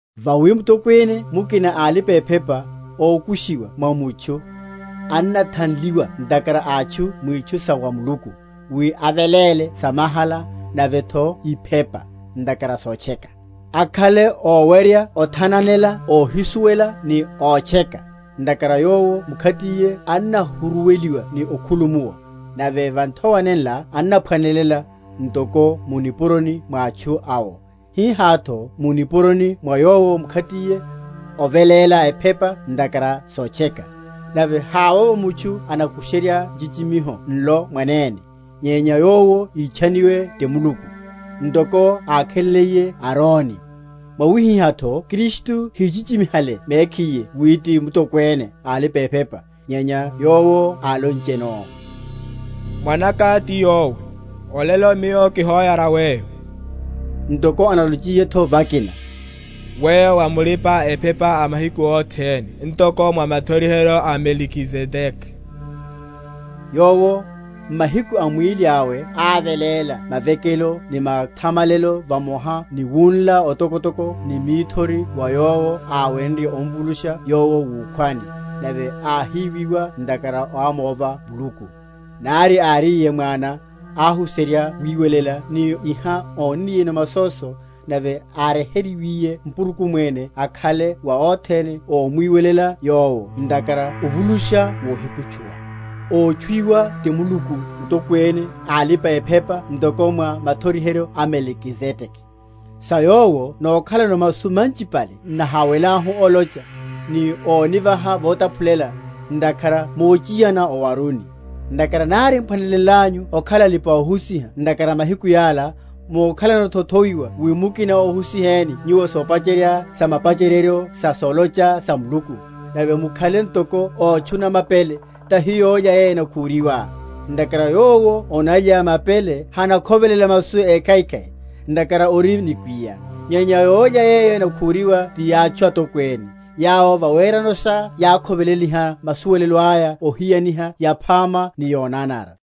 Vawi Mutokwene mukina a alipa‐ephepa, ókushiwa mwa mutchu, annathanleliwa ntakhara a atchu mwitchu sa wa Muluku, wi aveléle samahala, navetho iphepa, ntakhara sotcheka: akhale ówerya othananela óhísuwela ni ótcheka, ntakhara yowo mkhatiye annahuruweliwa ni okhulumuwa; nave va nthowa nenla annaphwanelela, ntoko mu nipuroni mwa atchu awo, hihátho mu nipuroni mwa yowo mkhatiye, oveléla ephepa ntakhara sotcheka. Nave havovo mutchu anikusherya nchichimiho nlo mwanene, nyenya yowo ítchaniwe ti Muluku, ntoko ákhaleliye Aroni. Mwawihihátho Kristu híchichimihale mekhiye wi ti Mutokwene a alipa‐ephepa, nyenya Yowo áloncheno, Mwanaka ti Yowe, Olelo Miyo kihoyara Weyo; Ntoko analochiyetho vakina, Weyo wa mulipa‐ephepa a mahiku othene Ntoko mwa mathoriheryo a Melikizedeke. Yowo, m’mahiku a mwíli awe áveléla mavekelo ni mathamalelo vamoha ni wunla otokotoko ni mithori wa Yowo áwenrye omvulusha Yowo wukhwani, nave áhíwiwa ntakhara ámova Muluku, nari áríye Mwana, ahuserya wiwelela ni iha ónniyeno masóso; nave áryeheryiwiye mpurukumene akhala wa othene ómwiwelela Yowo ntakhara ovulusha wohikutchuwa: ótchuwiwa ti Muluku Mutokwene a alipa‐ephepa ntoko mwa mathoriheryo a Melikizedeke. Sa Yowo nokhalano masu manchipale n’naháwelahu olocha, ni ónivaha votaphulela, ntakhara mochiyana owaruni. Ntakhara nari m’phwanelenlanyu okhala alipa‐ohusiha ntakhara a mahiku yala, mokhalanotho othoiwa wi mukina óhusiheni nyuwo sopacherya samapacheryeryo sa solocha sa Muluku; nave mukhale ntoko ótchuna mapele, tahi yólya yeyo enakhúriwa. Ntakhara yowo onalya mapele hanakhovelela masu ékhaikhai; ntakhara ori nikwiya. Nyenya yólya yeyo enakhúriwa ti yátchu atokwene, yawo vaweranosha yákhoveleliha masuwelelo aya ohiyaniha yaphama ni yonanara.